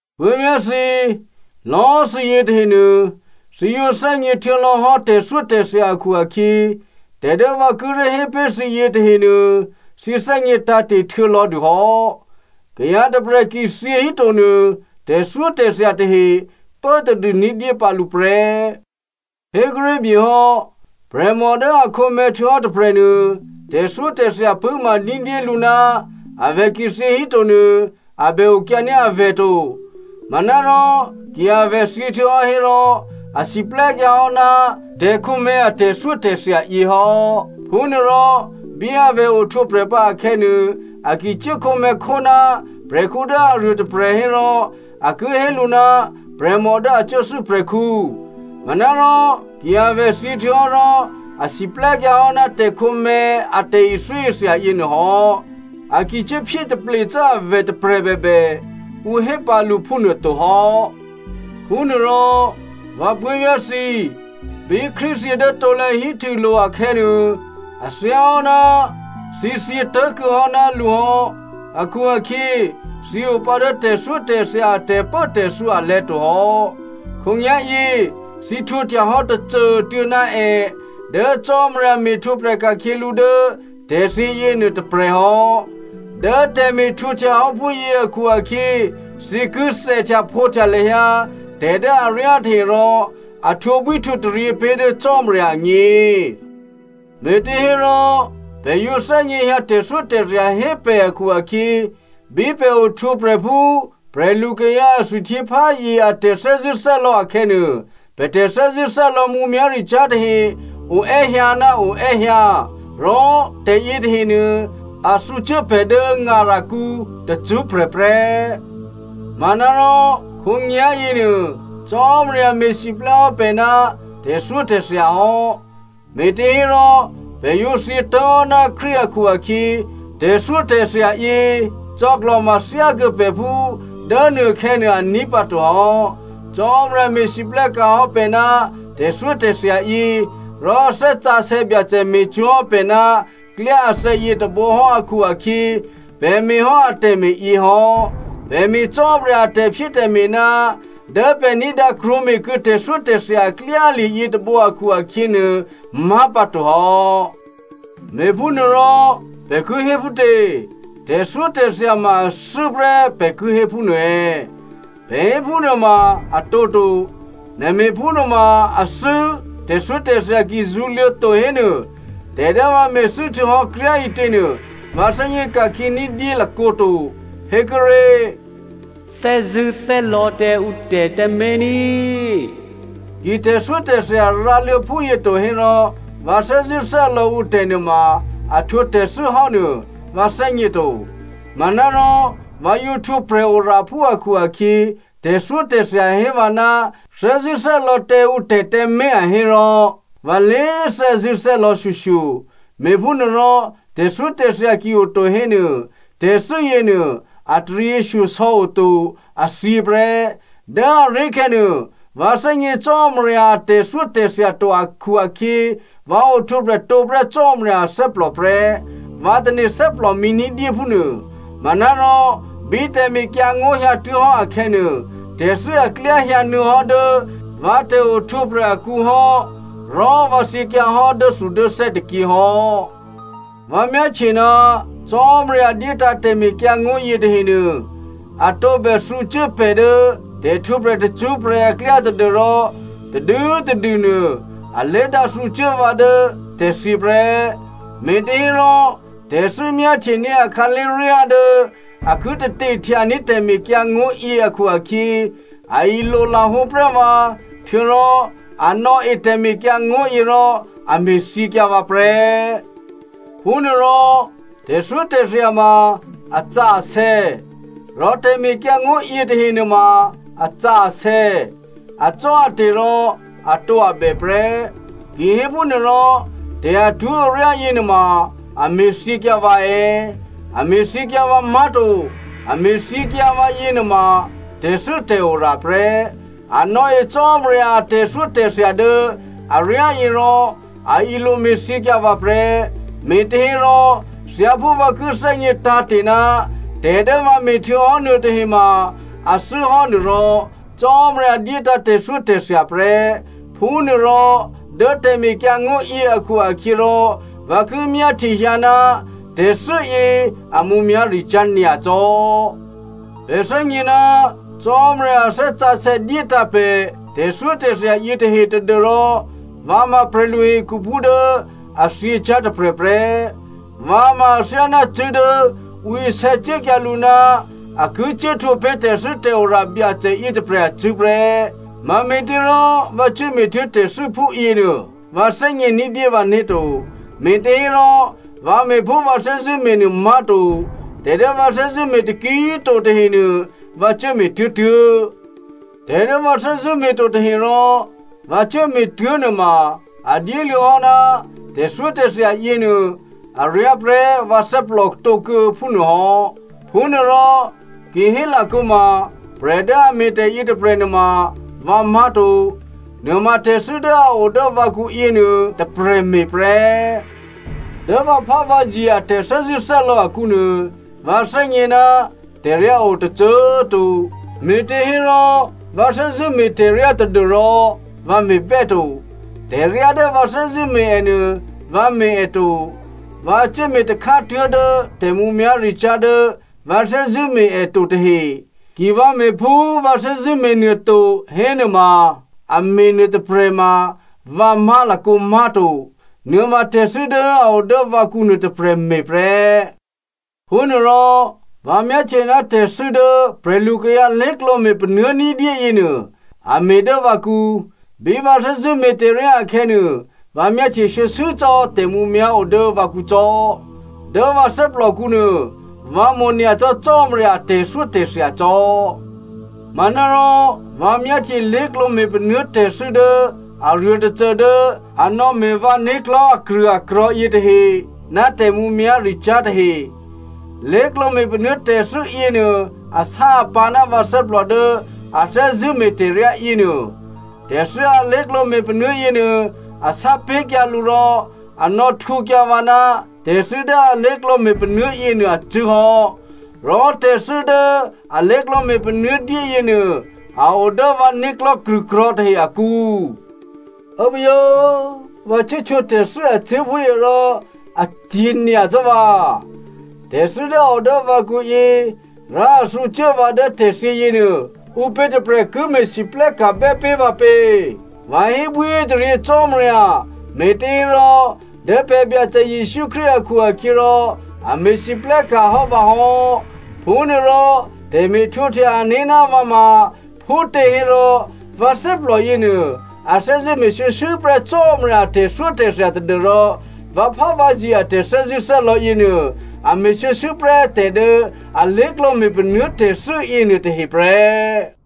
Puố̤vyá̤ thǐ꤮, lò̌꤮ thǐ yětahenuô thǐ yǒ thè́gně htuô̌lò̌hò́ tè̤thyótè̤thya akhu-akhyě, tè̤ dố vǎ kíré̤ hé pé̤ thǐ yětahenuô, thǐ thè́gně tǎ̤te̤ htuô̌ lò̌dûhò́. Kayǎ tôprè̤ ki thyě híto nuô, tè̤thyótè̤thya tahe pố tadû ní̤dyé pǎ lǔ prè́. Hékuốré̤ byehò́, prè̤mò dố a khǒmè̤̌ htuô̌hò́ tôprè̤nuô, tè̤thyótè̤thya pṳ̂́ma ní̤dyélǔ, avè̤ ki thyě híto nuô a bè okyǎní̤ avè̤ to. Manárò ki avè̤ thyěhtuô̌hò́ hérò a siplè́kyǎhò́ ná tè̤khǒmè̤̌ a tè̤thyótè̤thya yě hò́. Phúnuôrò, bí avè̤ ohtwǒprè̤ pǎ akhè̌nuô, a ki cuố khǒmè̤̌khó ná prè̤khǔ dố aruô tôprè̤ hérò ǔ ki hé lǔ ná prè̤mò dố a cuốthû́ prè̤khǔ. Manárò, ki avè̤ thyěhtuô̌hò́ rò a siplè́kyǎ hò́ ná tè̤khǒmè̤̌ a tè̤thyótè̤thya yěnuô hò́. A ki cuốphyé taple cò́ avè̤ tôprè̤ bèbè, ǔ hé pǎ lǔ phúnuôto hò́. Phúnuôrò, vǎ puố̤vyá̤ thǐ꤮, bí Krístu thyě dố krusulo̤ akhè̌nuô, a thyáhò́ ná thǐ thyě tố̤kuô̌hò́ ná lǔ hò́ akhu-akhyě, thǐ opǎ dố tè̤thyótè̤thya a tè̤pốtè̤thǔ alè̤̌ to hò́. Khǒnyá̤yě thǐ htwǒhtyahò́ tôcô꤮ tuô̌ ná è dố Cò́marya me̤htwǒprè̤ ka̤khyě lǔ dố tè̤thyě yěnuô tôprè̤ hò́. Dố tè̤me̤htwǒhtya hò́ phúyě akhu-akhyě, thǐ ki thèhtyaphǒhtya lahyǎ tè̤ dố aryá tahe rò a htwǒbwí htwǒtaryě pé̤ dố Cò́marya agně. Me̤těhénuôrò pè̤ yǒ thè́gněhyǎ tè̤thyótè̤thya hé pè̤ akhu-akhyě, bí pè̤ ohtwǒprè̤ phú prè̤lu kayǎ a thwihtyěpházye a tè̤thè́zṳ̂́thè́lò̌ akhè̌nuô, pè̤ tè̤thè́zṳ̂́thè́lò̌ mǔmyá̤ricyá̤ tahe oè́hyǎ ná oè́hyǎ. Rò tè̤ yětahenuô, a thǔcuố pè̤ dố ngarakǔ tacṳ́prè̤ prè́. Manárò khǒnyá̤ yěnuô, Cò́marya me̤siplè́ hò́ pè̤ ná tè̤thyótè̤thya hò́, me̤těhérò pè̤ yǒ thyě tố̤hò́ná Krístu akhu-akhyě, tè̤thyótè̤thya yě cò̌klò̤ma thyákuô̌ pè̤ phú dố nuôkhè̌nuô a ní̤pǎto hò́. Cò́marya me̤lwóhteka̤ hò́ pè̤ ná tè̤thyótè̤thya yě, rò Thè́ Sǎsè̌ Byacè me̤cwó̤hò́ pè̤ ná klyá athè̌ yětôbǒ hò́ akhu-akhyě, pè̤ me̤hò́ atè̤me̤ yěhò́. Pè̤ me̤ Cò́marya a tè̤phyétè̤me̤ ná dố pè̤ ní̤dǎ krwǒme̤kuô̌ tè̤thyótè̤thya aklyá lye̤ yětôbǒ akhu-akhyě nuô má̤ pǎtohò́. Me̤phúnuôrò pè̤ ki hé phútě? Tè̤thyótè̤thya ma athû́ prè́ pè̤ ki hé phúnuô è̌? Pè̤ hé phúnuôma a tǒto. Nè̤ me̤ phúnuôma athû́ tè̤thyótè̤thya ki zṳ̌luô̌ to hénuô, tè̤ dố vǎ me̤thû́ htuô̌hò́ kryá꤮ ǐtěnuô vǎ thè́gně ka̤khyě ní̤dyé lakǒto. Hékuốré̤, “Thè́zṳ̂́thè́lò̌ tǎ ǔ tè̤ tǎmé̤ ní,” ki tè̤thyótè̤thya rǎluô̌ phúyě to hérò, thè́zṳ̂́thè́lò̌ ǔtè̤ nuôma a htwǒ tè̤thû́ hò́ nuô, vǎ thè́gně to. Manárò vǎ yǒ htwǒ prè̤oraphú akhu-akhyě, tè̤thyótè̤thya hé vǎ ná thè́zṳ̂́thè́lò̌ tǎ ǔtè̤ tǎmé̤ a hérò, vǎ lé thè́zṳ̂́thè́lò̌ shyoshyo. Me̤phúnuôrò tè̤thyótè̤thya ki oto hénuô, tè̤thû́ yěnuô a taryěshyosò̌ o to, a thyě prè́. Dố aré̤khè̌ nuô, vǎ thè́gně Cò́marya a tè̤thyótè̤thya to akhu-akhyě, vǎ ohtwǒprè̤ tǒ prè́ Cò́marya athè́plò prè́, vǎ tane̤ thè́plòmǐ ní̤dyé phúnuô. Manárò bí tè̤mekyǎngó̤ hyǎtuố̤hò́ akhè̌nuô, tè̤thû́ aklyá hyǎnuô̌hò́ dố vǎ tè̤ohtwǒprè̤ akǔ hò́ rò vǎ thyěkyǎ hò́ dốthudốthè́ tôkyě hò́. Vǎ myáhtye ná Cò́marya dyétǎ̤ tè̤mekyǎngó̤ yětahenuô, a tǒbè thǔcuố pè̤ dố tè̤htwǒprè̤ tacṳ́prè̤ aklyá tadû́rò tadû꤮ tadû nuô alé̤dǎ thǔcuố vǎ dố tè̤thyě prè́. Me̤těhérò, tè̤thû́ myáhtyení̤ a khǎlé̤ryá dố a ki tate htyaní̤ tè̤mekyǎngó̤yě akhu-akhyě, a ilolahǒ prè́ vǎ, htuô̌rò a nò̌e tè̤mekyǎngó̤yě rò a me̤thyěkyǎ vǎ prè́. Phúnuôrò, tè̤thyótè̤thya ma asǎsè̌. Rò tè̤mekyǎngó̤yě tahe nuôma asǎsè̌, acò́ate̤ rò atǒabè prè́. Kihéphúnuôrò, tè̤ atwó̤aryá yěnuôma a me̤ thyěkyǎ vǎ è̌? A me̤thyěkyǎ vǎ má̤to. A me̤thyěkyǎ vǎ yěnuôma tè̤thû́tè̤ora prè́. A nò̌e Cò́marya a tè̤thyótè̤thya dố aryá yě rò a ilo me̤thyěkyǎ vǎ prè́. Me̤těhérò thyáphú vǎ ki thè́gně tǎ̤te̤ ná tè̤ dố vǎ me̤htuô̌hò́ nuôtahe ma a thû́hò́ nuôrò, Cò́marya dyétǎ̤ tè̤thyótè̤thya prè́. Phúnuôrò dố tè̤mekyǎngó̤ yě akhu-akhyěrò, vǎ ki myáhtyehyǎ ná tè̤thû́yě a mǔmyá̤ricyá̤ nyacò́. Pè̤ thè́gně ná Cò́marya a Thè́ Sǎsè̌ dyétǎ̤ pè̤ tè̤thyótè̤thya yětahe tadû́rò vǎ ma prè̤lu hekhuphú dố a thyěcyá̤ tôprè̤ prè́. Vǎ ma athyáná cṳ̂́ dố ǔ isè̌ cuốkyǎ lǔ ná a ki cuốhtwǒ pé̤ tè̤thû́tè̤ora Byacè yětôprè̤ acṳ̂́ prè́. Mame̤těrò vǎ cuố me̤tuố̤ tè̤thû́ phúyěnuô, vǎ thè́gně ní̤dyé vǎné̤ to. Me̤těhérò vǎ me̤ phú vǎ thè́zṳ̂́ me̤nuô má̤to. Tè̤ dố vǎ thè́zṳ̂́ me̤ taki꤮ to tahenuô vǎ cuốme̤ tuố̤tuố̤. Tè̤ dố vǎ thè́zṳ̂́ me̤to tahe rò vǎ cuốme̤tuố̤ nuôma a dyéluô̌hò́ ná tè̤thyótè̤thya yěnuô, aryá prè́ vǎ thè́plòtǒkuô̌ phúnuô hò́. Phúnuôrò, ki hélakǒma prè̤ dố a me̤ tè̤yě tôprè̤ nuôma vǎ má̤to. Nuôma tè̤thû́ dố a o dố vǎkǔ yěnuô tôprè̤ me̤ prè́. Dố vǎphávǎzye a tè̤thè́zṳ̂́thè́lò̌ akǔnuô, vǎ thè́gně ná tè̤ryá o tôcô꤮ to, me̤těhérò vǎ thè́zṳ̂́ me̤tè̤ryá tadû́rò vǎ me̤bè́to. Tè̤ryá dố vǎ thè́zṳ̂́ me̤ ènuô, vǎ me̤ è to, vǎ cuố me̤ takhátuố̤ dố tè̤mǔmyá̤ricyá̤ dố vǎ thè́zṳ̂́ me̤ è to tahe. Ki vǎ me̤ phú vǎ thè́zṳ̂́ me̤nuô to hénuôma, a me̤ nuôtôprè̤ ma vǎ má̤lakǒ má̤to. Nuôma tè̤thû́ dố a o dố vǎkǔ nuôtôprè̤ me̤ prè́. Phúnuôrò vǎ myáhtye ná tè̤thû́ dố prè̤lukayǎ lé̤klǒme̤ panuố̤ ní̤dyé yěnuô a me̤ dố vǎkǔ. Bí vǎ thè́zṳ̂́ me̤tè̤ryá akhè̌nuô, vǎ myáhtye shuô̌shuô̌ cò́ tè̤mǔmyá̤ o dố vǎkǔ cò́. Dố vǎ thè́plòkǔ nuô vǎ mo̤ nyacò́ Cò́marya a tè̤thyótè̤thya cò́. Manárò vǎ myáhtye lé̤klǒ me̤panuố̤ tè̤thû́ dố aruô tôcô dố a nò̌me̤ vǎ né̤klò̤́ akrṳ̂akrò̤̌ yětahe ná tè̤mǔmyá̤ricyá̤ tahe. Lé̤klǒ me̤panuố̤ tè̤thû́ yěnuô asá-apǎ̤ ná vǎ thè́plò dố a thè́zṳ̂́me̤ tè̤ryá yěnuô. Tè̤thû́ alé̤klǒ me̤panuố̤ yěnuô, a sápé̤kyǎ lǔ rò a nò̌htwǒkyǎ vǎ ná tè̤thû́ dố alé̤klǒ me̤panuố̤ yěnuô acṳ̂́ hò́. Rò tè̤thû́ dố alé̤klǒ me̤panuố̤ dyé yěnuô a o dố vǎ né̤klò̤́ krṳ̂krò̤̌ tahe akǔ. Ố꤮ buố uố! Vǎ cuố htwǒ tè̤thû́ acṳ̂́ phúyě rò acyě̤ nyacò́ vǎ. Tè̤thû́ dố a o dố vǎkǔyě rò a thǔcuố vǎ dố tè̤thyě yěnuô, ǔpě tôprè̤ ki me̤lwóhteka̤ bè́ pé̤ vǎ pě? Vǎ hébwíhétaryě Cò́marya, me̤těhérò dố pè̤ Byacè Jesǔ Krístu akhu-akhyěrò, a me̤lwóhteka̤ hò́ vǎ hò́. Phúnuôrò tè̤me̤htwǒhtya ané̤ ná vǎ ma phútěhérò vǎ thè́plò yěnuô, a thè́zṳ̂́ me̤ shuô̌shuô̌ prè́ Cò́marya a tè̤thyótè̤thya tadû́rò vǎphávǎzye a tè̤thè́zṳ̂́thè́lò̌ yěnuô a me̤ shuô̌shuô̌prè́ tè̤ dố alé̤klǒ me̤panuố̤ tè̤thû́ yěnuôtahe prè́.